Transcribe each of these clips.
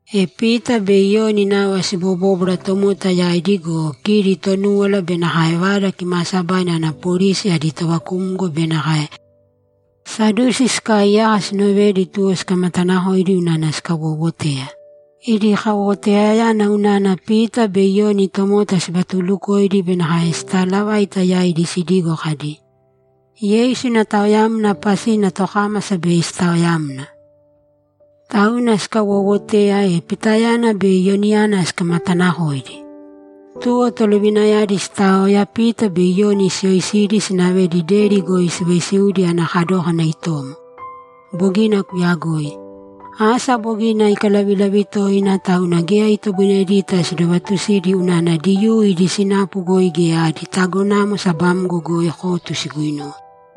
E Pita be Iyoni nava sibobóbwara tomota yaidi go, kidi Tonúwala be nakae Vada Kimaasabaina ana polisi adi tovakumgo be nakae Sadusi sikaaiyaka sinovedi tuwo sikamatanakoidi unana sikawowoteya. Idi kawowoteyayana unana Pita be Iyoni tomota sivatuulukoidi be nakae sitaalavaita yaidi sidigo kadi, ‘Yeisu ina taoyamna pasina tokámasa bei sitaoyamna.’ Tauna sikawowoteya, e Pitayana be Iyoniyana sikamatanakoidi. Tuwo tolovinayadi sitaoya, Pita be Iyoni siyoisidi, sinavedi deri goi sivaisiudi ana kadókana itomo. Bogina kuyagoi. Asa bogina ikalavilavi toina, tauna geya itoboinedita sidovatusidi unana Diyuu idi sinapu goi geya adi tagonamo sabamgo goi kotu siguinuwe.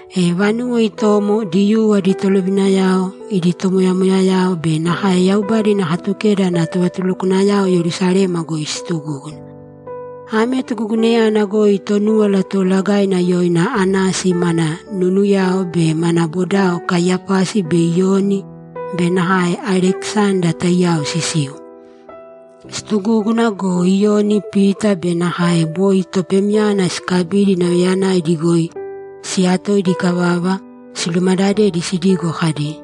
E vanuwo itomo, Diyuu adi tolovinayao, idi tomoyamoyayao be nakae Yaubada ina Katukeda ana tovatulukwanayao Yerusalema goi situgúguna. Ame tugugunayana goi Tonúwala Toolagaina yoina Anasi mana nunuyao be mana bodao Kaiyapasi be Iyoni be nakae Alekisanda taiyao sisiu. Situgúguna go, Iyoni, Pita be nakae boi topemyana sikabidi nauyayanaidi goi siyatoidi ikavava, silumadadedi sidigo kadi,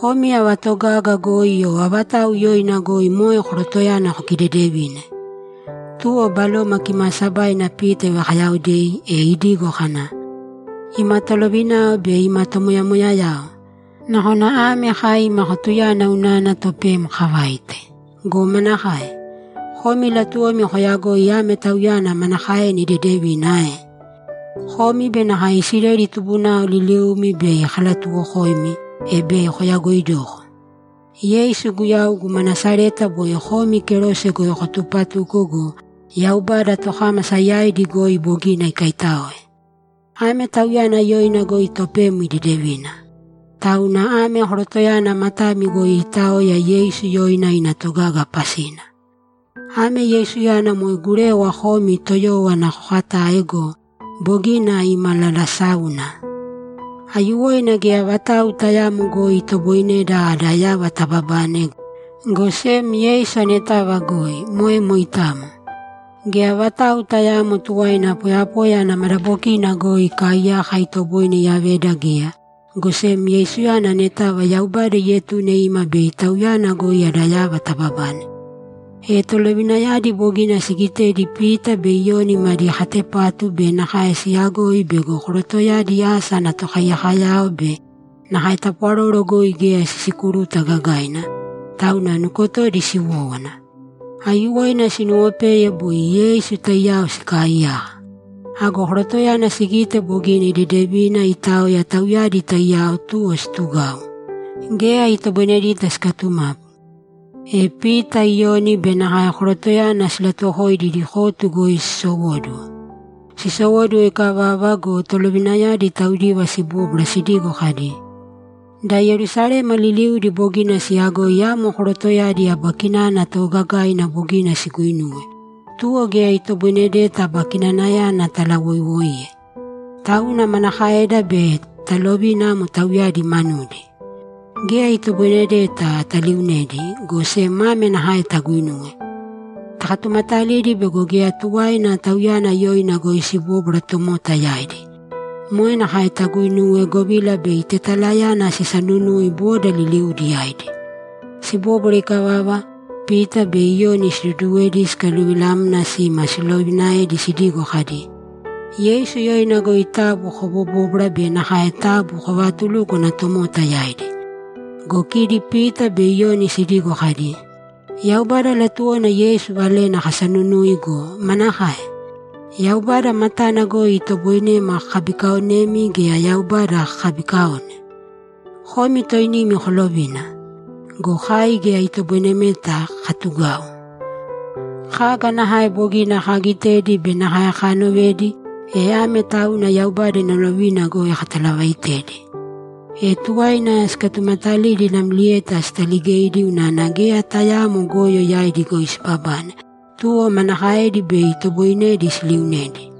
‘Komi ava togaga goi o avatau yoina goi moe korotoyana kokidedevine?’ Tuwo Baloma Kimaasabaina Pita ivakayaodei, e idigo kana, ‘Ima tolovinao be ima tomoyamoyayao, nakona ame kai ima kotuyana unana topem kavaite. Go manakae? Komi latuwomi koyagoi ame tauyana manakaena idedevina ae? Komi be nakae Isileli tubunao liliumi bei kalatuwokoimi, e bei koyagoidoko. Yeisu Guyau guma Nasareta boi komi kerose goi kotupatuko go, Yaubada tokámasa yaidi goi bogina ikaitáoe. Ame Tauyana yoina goi topem idedevina. Tauna ame korotoyana matami goi iitaoya Yeisu yoina ina togaga pasina. Ame Yeisuyana moe gurewa komi toyówana kokatae go, bogina imalalasáuna. Aiyuwoina geya vatau tayaamo goi itoboineda ada yava tababane, go sem Yeisu anetava goi. Moe moitamo. Geya vatau tayaamo tuwaina poyapoya ana madabokina goi ikaaiyaka itoboine iyaveda geya, go sem Yeisuyana anetava Yaubada ietune ima bei Tauyana goi ada yava tababane.’ E tolovinayadi bogina sigitedi Pita be Iyoni madi katepatu be nakae siyagoi bego korotoyadi asa ana tokaiyakoyao be nakae tapwaroro goi geya sisikuruta gagaina, tauna nukotodi siwówana. Aiyuwoina sinuwopeye boi Yeisu taiyao sikaaiyaka. Ago korotoyana sigite bogina idedevina iitaoya tauyadi taiyao, tuwo situgau; geya itoboinedita sikatumapu. E Pita, Iyoni be nakae korotoyana silatuwokoidi idi kotu goi sisowóduwo. Sisowóduwo ikavava go, tolovinayadi taudiva sibóbwara sidigo kadi, ‘Da Yerusalema liliudi bogina siyagoi amo korotoyadi aba kinana toogagaina bogina siguinuwe, tuwo geya itoboinedeta aba kinanayana talawoiwoiye. Tauna manakaeda bei talovina amo tauyadi manudi? Geya itoboinedeta taliunedi, go sem ame nakae taguinūwe: Takatumatalīdi bego geya tuwaina Tauyana yoina goi sibóbwara tomota yaidi. Moe nakae taguinūwe, govila bei tetalayana sisanunui boda liliudi yaidi.’ Sibóbwara ikavava, Pita be Iyoni siduduwedi sikaluvilamna sima silovinaedi sidigo kadi, ‘Yeisu yoina goi taabu kobobōbwara be nakae taabu kovaatulūkwana tomota yaidi.’ Go kidi Pita be Iyoni sidigo kadi, ‘Yaubada latuwona Yeisu valena kasanunui go, manakae? Yaubada matana goi itoboinema kakabikaonemi gea Yaubada kakabikaone? Komi toinimi kolovīna. Go kai geya itoboinemeta katugau. Kaga nakae bogina kaagitedi be nakae kaanovedi, e ame tauna Yaubada ina lovina goi katalavaaitedi.’ E tuwaina sikatumatalidi namlieta sitaligeidi unana geya tayaamo goyo yaidi goi sibabane, tuwo manakaedi bei itoboinedi siliunedi?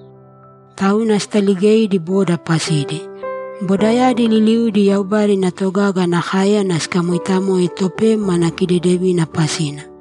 Tauna sitaligeidi boda pasidi. Bodayadi liliuudi Yaubada ina togaga ana káeyana sikamoitamoe topem ana kidedevina pasina.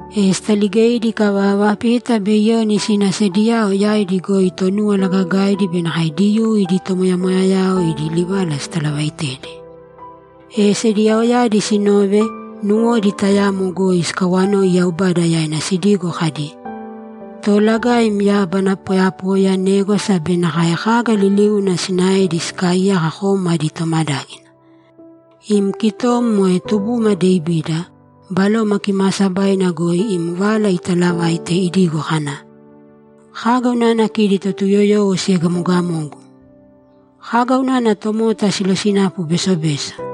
E sitaligeidi ikavava, Pita be Iyoni sina sediyao yaidi goi Tonúwala Gagaidi be nakae Diyuu idi tomoyamoyayao idi livala sitalavaitedi. E sediyaoyadi sinove, nuwodi tayamo goi sikawanoi Yaubada yaina sidigo kadi, ‘Toolagaim, yábana, poyapoya, négwasa be nakae kaga liliuna sinaedi sikaaiyaka kom adi tomadágina. Im kitom, moe tubuma Devida, Baloma Kimaasabaina goi im vala italavaite idigo kana, “Kaga unana kidi Totuyoyowo siegamogamogu? Kaga unana tomota silosinapu besobeso?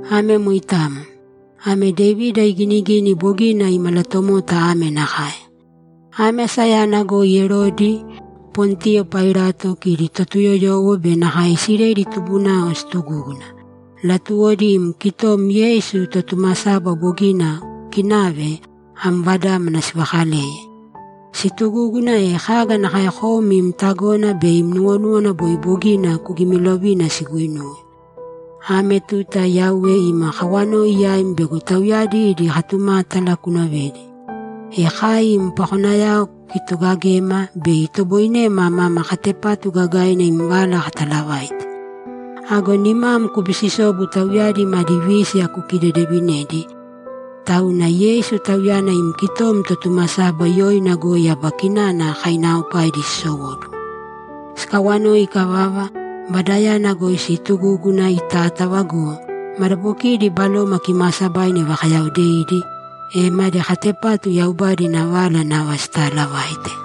Ame moitamo. Ame Devida iginigini bogina imalatomota ame nakae: Ame asayana goi Erodi, Pontiyo Pailato, kidi Totuyoyowo be nakae Isileli tubunao situgúguna; latuwodi im kitom Yeisu Totumasaba bogina kuukinave am Vadámana sivakaleye. Situgúguna, e kaga nakae kom im tagona be im nuwonúwana boi bogina kugimilovina siguinuwe. Ame tuta, Yauwe, ima kawanoi yaim bego tauyadi idi katumátala kunovedi, e kai im pakonayao kukitogagēma bei itoboinema mama katepatu gagaina im vala katalavaite. Ago nimam kubisisōbu tauyadi madi vísiya kukidedevinēdi, tauna Yeisu, Tauyana im kitom Totumasaba, yoina goi aba kinana kainaaopaidi sisowóduwo.’ Sikawanoi ikavava, vadayana goi siitugúguna itátava go, madabokidi Baloma Kimaasabaina ivakayaodeidi, e madi katepatu Yaubada ina vala nava sitaalavaite.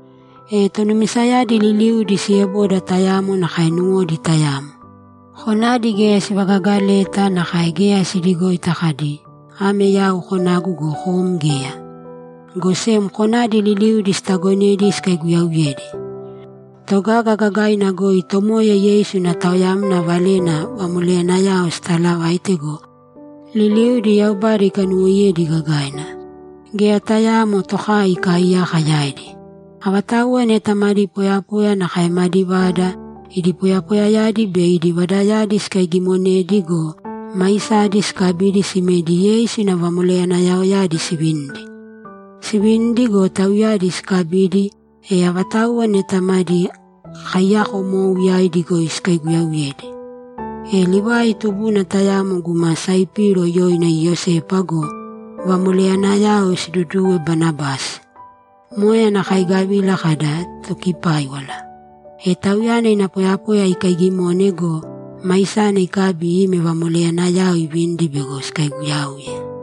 E tonumisayadi liliudi sieboda tayamo nakae nuwodi tayamo. Konadi geya sivagagaleta, nakae geya sidigoita kadi, ‘Ame yau konagu go, kom geya.’ Go sem konadi liliudi sitagonedi sikaiguyauyedi. Togaga gagaina goi Tomoya Yeisu ina taoyamna valena vamoleyanayao sitaalavaite go, liliudi Yaubada ikanuwoiyedi gagaina. Geya tayaamo tokai ikaaiyaka yaidi. Avatauwa neta madi poyapoya nakae madi vada, idi poyapoyayadi be idi vadayadi sikaigimonedi go, maisadi sikabidi simedi Yeisu ina vamoleyanayaoyadi sivinidi. Sivinidi go, tauyadi sikabidi, e avatauwa neta madi kaiyakomou, yaidi goi sikaiguyauyedi. E Livai tubuna tayamo guma Saipiro yoina Iyosepa go, vamoleyanayao siduduwe Banabasi. Moe ana kaigavila kada, ‘Tokipáiwala.’ E tauyana ina poyapoya ikaigimone go, maisana ikabi ime vamoleyanayao ivinidi bego sikaiguyauye.